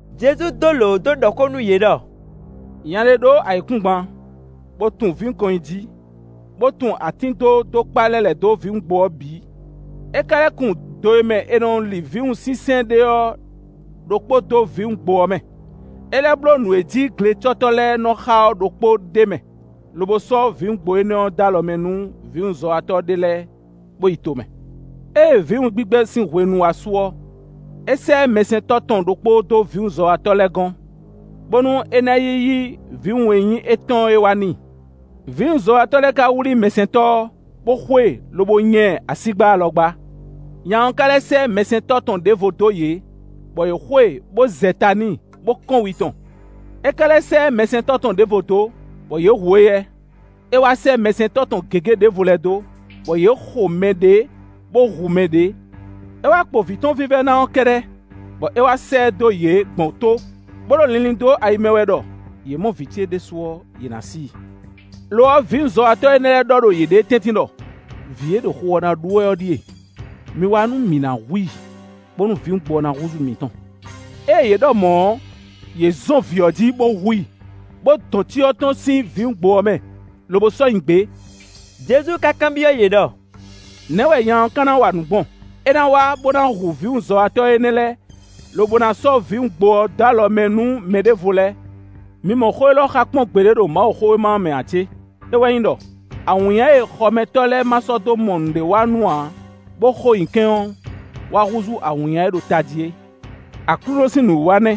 Jezu dó lǒ dó ɖɔ xó nú yě ɖɔ: “Nya ɖé ɖó ayǐkúngban, bó tun vǐwun kɔn nyi jí, bó tun atín dó dó kpá lɛ́ lɛ̌ dó vǐwungbo ɔ́ bǐ; é ka lɛ́ kun do e mɛ è nɔ li vǐwun sínsɛ́n ɖe ɔ́ ɖokpó dó vǐwungbo ɔ́ mɛ. É lɛ́ bló nǔ e jí glecɔ́tɔ́ lɛ́ɛ nɔ́ xá ɔ́ ɖokpó d'é mɛ, lobo sɔ́ vǐwungbo énɛ́ dó alɔ mɛ nú vǐwunzɔ́watɔ́ ɖé lɛ́ɛ, bó yi tomɛ. Ée vǐwun gbigbɛ sín hwenu wá su ɔ́, é sɛ́ mɛsɛntɔ́ tɔn ɖokpó dó vǐwunzɔ́watɔ́ lɛ́ɛ gɔ́n, bónú é ná yi yí vǐwun e nyí étɔn é wá n'i. Vǐwunzɔ́watɔ́ lɛ́ɛ ka wlí mɛsɛntɔ́ ɔ́, bó xo e, lobo nya ɛ asígbá alɔgbá. Nya ɔ́ ka lɛ́ sɛ́ mɛsɛntɔ́ tɔn ɖěvo dó yě, bɔ yě xo e, bó zɛ ta n'i, bó kɔ́n wi tɔn. É ka lɛ́ sɛ́ mɛsɛntɔ́ tɔn ɖěvo dó, bɔ yě hu éyɛ́. É wá sɛ́ mɛsɛntɔ́ tɔn gěgé ɖěvo lɛ́ɛ dó, bɔ yě xo mɛ ɖě, bó hu mɛ ɖě. É wá kpo vǐ tɔn vívɛ́ná ɔ́ kɛ́ɖɛ́, bɔ é wá sɛ́ ɛ dó yě gbɔn tó, bó ɖo linlin ɖo ayi mɛ wɛ ɖɔ: ‘Yě mɔ vǐ ce ɖésú ɔ́, yě ná sí i.’ Lo ɔ́, vǐwunzɔ́watɔ́ énɛ́ lɛ́ɛ ɖɔ ɖo yěɖée tɛ́ntin ɖɔ: ‘Vǐ e ɖo xu ɔ́ ná ɖu wɛ ɔ́ ɖíe, mi wá nú mǐ ná hu i, bónú vǐwungbo ɔ́ ná húzú mǐtɔn.’ Ée yě ɖɔ mɔ̌ ɔ́, yě zɔn vǐ ɔ́ jí bó hu i, bó dɔn cyɔ tɔn sín vǐwungbo ɔ́ mɛ, lobo sɔ́ nyi gbě.” Jezu ka kanbyɔ́ yě ɖɔ: “Nɛ̌ wɛ nya ɔ́ ka ná wa nǔ gbɔn? É ná wá, bó ná hu vǐwunzɔ́watɔ́ énɛ́ lɛ́ɛ, lobo ná sɔ́ vǐwungbo ɔ́ dó alɔ mɛ nú mɛ ɖěvo lɛ́ɛ. Mi mɔ xó élɔ́ xa kpɔ́n gbeɖé ɖo Mawuxówéma ɔ́ mɛ ǎ cé? É wɛ nyí ɖɔ: ‘Awǐnnya e xɔmɛtɔ́ lɛ́ɛ má sɔ́ dó mɔ nǔɖéwanú ǎ bó xo nyi kɛ́n ɔ́, wá húzú awǐnnya e ɖo tají é. Aklúnɔ sín nǔwiwa nɛ́,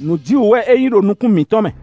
nǔjíwǔ wɛ é nyí ɖo nukún mǐtɔn mɛ.’”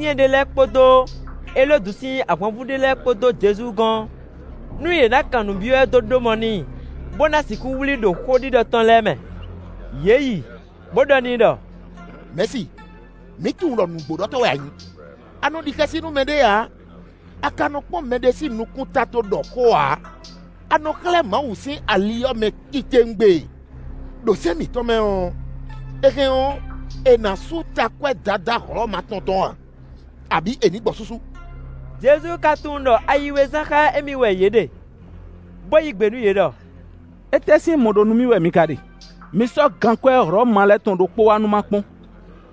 È sɛ́ Falizyɛn ɖé lɛ́ɛ kpódó Elódu sín ahwanvú ɖé lɛ́ɛ kpó dó Jezu gɔ́n, nú yě ná kan nǔ byɔ́ ɛ dó ɖó mɔ n'i, bó ná sixú wlí i ɖo xóɖiɖɔ tɔn lɛ́ɛ mɛ. Yě yi, bó ɖɔ n'i ɖɔ: “Mɛ̌si, mǐ tunwun ɖɔ nǔgbóɖɔtɔ́ wɛ a nyǐ; a nɔ ɖi xɛsi nú mɛɖé ǎ, a ka nɔ kpɔ́n mɛɖé sín nukúnta dó ɖɔ xó ǎ; a nɔ xlɛ́ Mawu sín ali mɛ titewungbe. Đo sɛ́n mǐtɔn mɛ ɔ́, è hɛn ɔ́, è nǎ sú takwɛ́ Dadá Hlɔ̌ma tɔn tɔn a, abǐ è nǐ gbɔ súsú?” Jezu ka tunwun ɖɔ ayi we zán xá émí wɛ yě ɖe, bó yí gbe nú yě ɖɔ: “Étɛ́ sín mɔ ɖó nú mì wɛ mi ka ɖe? Mi sɔ́ gankwɛ́ Hlɔ̌manu lɛ́ɛ tɔn ɖokpó wá nú ma kpɔ́n.”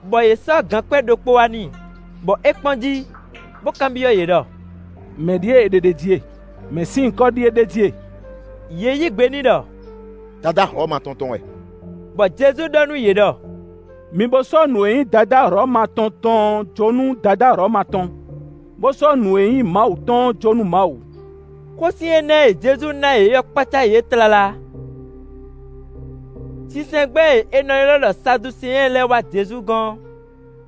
Bɔ yě sɔ́ gankwɛ́ ɖokpó wá n'i, bɔ é kpɔ́n jí, bó kanbyɔ́ yě ɖɔ: “Mɛ̌ ɖíe è ɖe ɖ'é jí e? Mɛ̌ sín nyǐkɔ ɖíe ɖ'é jí e?” Yě yí gbe n'i ɖɔ: “Dadá Hlɔ̌ma tɔn tɔn wɛ.” Bɔ Jezu ɖɔ nú yě ɖɔ: “Mi bo sɔ́ nǔ e nyí Dadá Hlɔ̌ma tɔn tɔn ɔ́ jó nú Dadá Hlɔ̌ma tɔn, bó sɔ́ nǔ e nyí Mawu tɔn ɔ́ jó nú Mawu.” Xósin énɛ́ e Jezu ná yě ɔ́ kpácá yě tlala. Mɛkúkú lɛ́ɛ ná fɔ́n a? Sinsɛngbɛ́ e è nɔ ylɔ́ ɖɔ Saduseɛn lɛ́ɛ wá Jezu gɔ́n;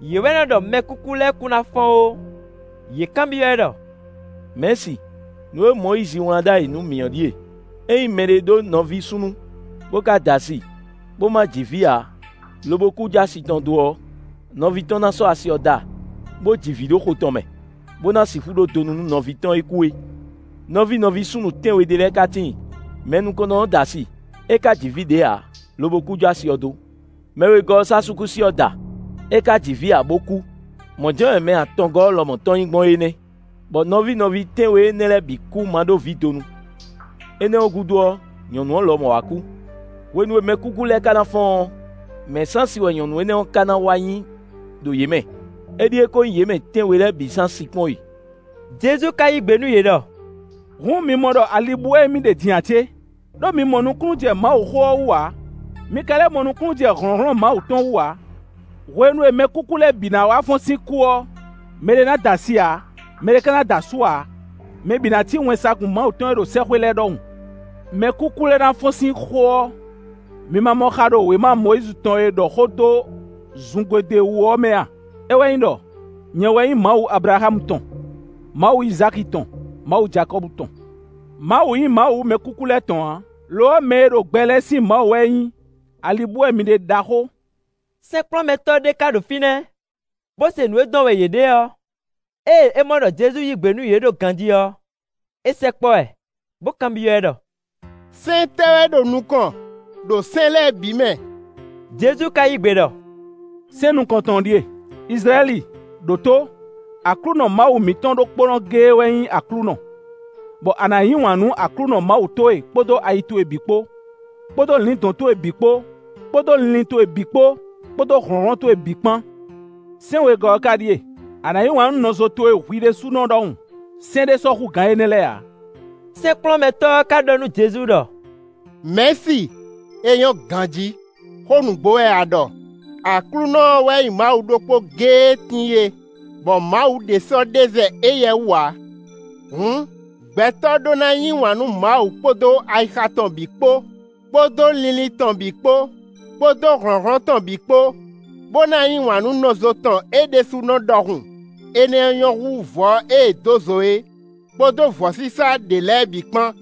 (yě wɛ nɔ ɖɔ mɛkúkú lɛ́ɛ kún ná fɔ́n ó.) Yě kanbyɔ́ ɛ ɖɔ: “Mɛ̌si, nǔ e Mɔyízi wlán ɖ'ayǐ nú mǐ ɔ́ ɖíe: ‘Ényí mɛɖé ɖó nɔví súnnu, bó ka da asi, bó má ji vǐ ǎ, lobo kú jó asi tɔn dó ɔ́, nɔví tɔn ná sɔ́ asi ɔ́ da, bó ji vǐ ɖo xo tɔn mɛ, bó ná sixú ɖó donu nú nɔví tɔn e kú é.’ Nɔví nɔví súnnu tɛ́nwe ɖé lɛ́ɛ ka tíin. Mɛ nukɔntɔn ɔ́ da asi, é ka ji vǐ ɖě ǎ, lobo kú jó asi ɔ́ dó. Mɛ wegɔ́ ɔ́ sɔ́ asúkúsi ɔ́ da; é ka ji vǐ ǎ, bo kú. Mɔ̌ jɛ́n wɛ mɛ atɔngɔ́ ɔ́ lɔmɔ̌ tɔn nyí gbɔn é nɛ́. Bɔ nɔví nɔví tɛ́nwe énɛ́ lɛ́ɛ bǐ kú ma ɖó vǐ donu. Énɛ́ ɔ́ gúdo ɔ́, nyɔ̌nu ɔ́ lɔmɔ̌ wá kú. Hwenu e mɛkúkú lɛ́ɛ ka na fɔ́n ɔ́, mɛ̌ sín asi wɛ nyɔ̌nu énɛ́ ɔ́ ka na wá nyí ɖo yě mɛ? Éɖíe ko nyí yě mɛ tɛ́nwe lɛ́ɛ bǐ sín asi kpɔ́n e.” Jezu ka yí gbe nú yě ɖɔ: “Hǔn mi mɔ ɖɔ ali bú wɛ émí ɖe din ǎ cé? Đó mi mɔ nukúnnú jɛ Mawuxó ɔ́ wú ǎ, mi ka lɛ́ mɔ nukúnnú jɛ hlɔ̌nhlɔ́n Mawu tɔn wú ǎ. Hwenu e mɛkúkú lɛ́ɛ bǐ ná wá fɔ́n sín kú ɔ́, mɛɖé ná da asi ǎ, mɛɖé ka ná da asú ǎ. Mɛ bǐ ná cí wɛnsagun Mawu tɔn e ɖo sɛ́xwé lɛ́ɛ ɖɔhun. Mɛkúkú lɛ́ɛ ná fɔ́n sín xó ɔ́, mi ma mɔ xa ɖo wěma Mɔyízi tɔn e ɖɔ xó dó zungodwe ɔ́ wú ɔ́ mɛ a? É wɛ nyí ɖɔ: ‘Nyɛ wɛ nyí Mawu Ablaxámu tɔn, Mawu Izáki tɔn, Mawu Jakɔ́bu tɔn.’ Mawu nyí Mawu mɛkúkú lɛ́ɛ tɔn ǎ; lo ɔ́, mɛ e ɖo gbɛ lɛ́ɛ sín Mawu wɛ é nyí. Ali bú wɛ mi ɖe ɖaxó.” Sɛ́nkplɔ́nmɛtɔ́ ɖé ká ɖo fínɛ́, bó se nǔ e dɔn wɛ yě ɖe ɔ́. Ée é mɔ ɖɔ Jezu yí gbe nú yě ɖó ganjí ɔ́, é sɛkpɔ́ ɛ, bó kanbyɔ́ ɛ ɖɔ: “Sɛ́n tɛ́ wɛ ɖo nukɔn ɖo sɛ́n lɛ́ɛ bǐ mɛ?” Jezu ka yí gbe ɖɔ: “Sɛ́n nukɔntɔn ɔ́ ɖíe: ‘Izlayɛ́li, ɖǒtó! Aklúnɔ Mawu mǐtɔn ɖokpónɔ géé wɛ nyí Aklúnɔ, bɔ a nǎ yí wǎn nú Aklúnɔ Mawu towe kpódó ayi towe bǐ kpó, kpódó lǐndɔ̌n towe bǐ kpó, kpódó linlin towe bǐ kpó, kpódó hlɔ̌nhlɔ́n towe bǐ kpán.’ Sɛ́n wegɔ́ ɔ́ ká ɖíe: ‘A nǎ yí wǎn nú nɔzo towe hwi ɖésúnɔ ɖɔhun.’ Sɛ́n ɖé sɔ́ hú gǎn énɛ́ lɛ́ɛ ǎ.” Sɛ́nkplɔ́nmɛtɔ́ ɔ́ ká ɖɔ nú Jezu ɖɔ: “Mɛ̌si, é nyɔ́ ganjí, xó nǔgbó wɛ a ɖɔ; Aklúnɔ ɔ́ wɛ nyí Mawu ɖokpó géé e tíin é, bɔ Mawu ɖě sɔ́ ɖe zɛ éyɛ́ wú ǎ. Hǔn, gbɛtɔ́ ɖó ná yí wǎn nú Mawu kpódó ayixa tɔn bǐ kpó, kpódó linlin tɔn bǐ kpó, kpódó hlɔ̌nhlɔ́n tɔn bǐ kpó, bó ná yí wǎn nú nɔzo tɔn é ɖésúnɔ ɖɔhun; énɛ́ ɔ́ nyɔ́ hú vɔ̌ e è dó zo é, kpódó vɔ̌sísá ɖě lɛ́ɛ bǐ kpán.”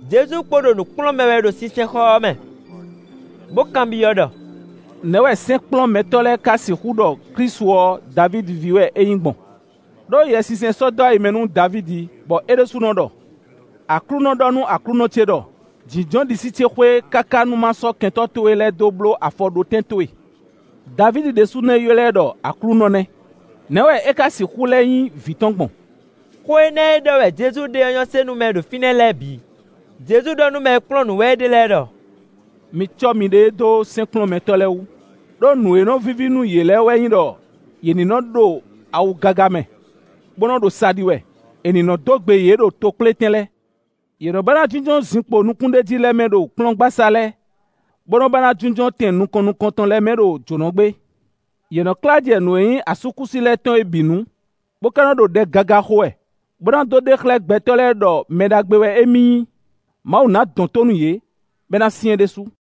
Jezu kpo ɖo nǔ kplɔ́n mɛ wɛ ɖo sinsɛnxɔ ɔ́ mɛ, bó kanbyɔ́ ɖɔ: “Nɛ̌ wɛ sɛ́nkplɔ́nmɛtɔ́ lɛ́ɛ ka sixú ɖɔ Klísu ɔ́ Davídi ví wɛ é nyí gbɔn? Đó Yɛsinsɛn sɔ́ dó ayi mɛ nú Davídi, bɔ é ɖésúnɔ ɖɔ: ‘Aklúnɔ ɖɔ nú Aklúnɔ ce ɖɔ: Jǐnjɔ́n ɖisí ce xwé, káká nú má sɔ́ kɛntɔ́ towe lɛ́ɛ dó bló afɔɖótɛn towe.’ Davídi ɖésú nɛ́ ylɔ́ ɛ ɖɔ ‘Aklúnɔ’ nɛ́. Nɛ̌ wɛ é ká sixú lɛ́ nyí vǐ tɔn gbɔn?” Xó énɛ́ e ɖɔ wɛ Jezu ɖe ɔ́ nyɔ́ se nú mɛ e ɖo fínɛ́ lɛ́ɛ bǐ. Jezu ɖɔ nú mɛ e kplɔ́n nǔ wɛ é ɖe lɛ́ɛ ɖɔ: “Mi cɔ́ miɖée dó sɛ́nkplɔ́nmɛtɔ́ lɛ́ɛ wú, ɖó nǔ e nɔ víví nú yě lɛ́ɛ wɛ nyí ɖɔ yě ní nɔ́ ɖo awu gaga mɛ, bó nɔ́ ɖo sa ɖi wɛ; è nǐ nɔ́ dó gbe yě ɖo tokplétɛn lɛ́ɛ. Yě nɔ́ ba ná jínjɔ́n zinkpo nukúnɖéjí lɛ́ɛ mɛ ɖo kplɔ́ngbasá lɛ́ɛ, bó nɔ́ ba ná jínjɔ́n tɛn nukɔn nukɔntɔn lɛ́ɛ mɛ ɖo jǒnɔgbé. Yě nɔ́ klá jɛ nǔ e nyí asúkúsi lɛ́ɛ tɔn é bǐ nu, bó ka nɔ́ ɖo ɖɛ gaga xo wɛ, bó ná dó ɖe xlɛ́ gbɛtɔ́ lɛ́ɛ ɖɔ mɛ ɖagbe wɛ émí nyí. Mawu ná dɔn tó nú yě, bɔ é ná syɛ́n ɖésú.”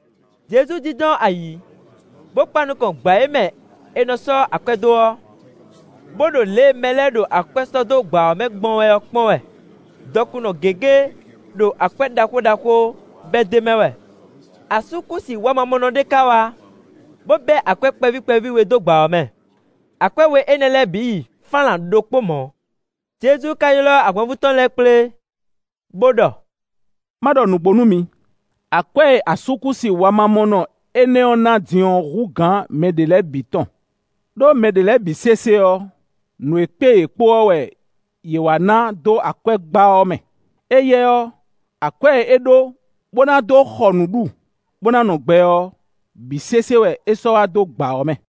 Jezu jínjɔ́n ayǐ, bó kpan nukɔn gbǎ e mɛ è nɔ sɔ́ akwɛ́ dó ɔ́, bó ɖo lě e mɛ lɛ́ɛ ɖo akwɛ́ sɔ́ dó gbǎ ɔ́ mɛ gbɔn wɛ ɔ́ kpɔ́n wɛ. Dɔkunnɔ gěgé ɖo akwɛ́ ɖaxó ɖaxó bɛ́ d'é mɛ wɛ. Asúkúsi wamamɔnɔ ɖé ka wá, bó bɛ́ akwɛ́ kpɛví kpɛví we dó gbǎ ɔ́ mɛ; akwɛ́ we énɛ́ lɛ́ɛ bǐ yi fánlan ɖokpó mɔ̌. Jezu ka ylɔ́ ahwanvú tɔn lɛ́ɛ kplé, bó ɖɔ: “Má ɖɔ nǔgbó nú mi, akwɛ́ e asúkúsi wamamɔnɔ énɛ́ ɔ́ ná din ɔ́ hú gǎn mɛ ɖě lɛ́ɛ bǐ tɔn. Đó mɛ ɖě lɛ́ɛ bǐ sésé ɔ́, nǔ e kpé yě kpo ɔ́ wɛ yě wá ná dó akwɛ́gbá ɔ́ mɛ. Éyɛ́ ɔ́, akwɛ́ e é ɖó bó ná dó xɔ nǔ ɖu, bó ná nɔ gbɛ ɔ́, bǐ sésé wɛ é sɔ́ wá dó gbǎ ɔ́ mɛ.”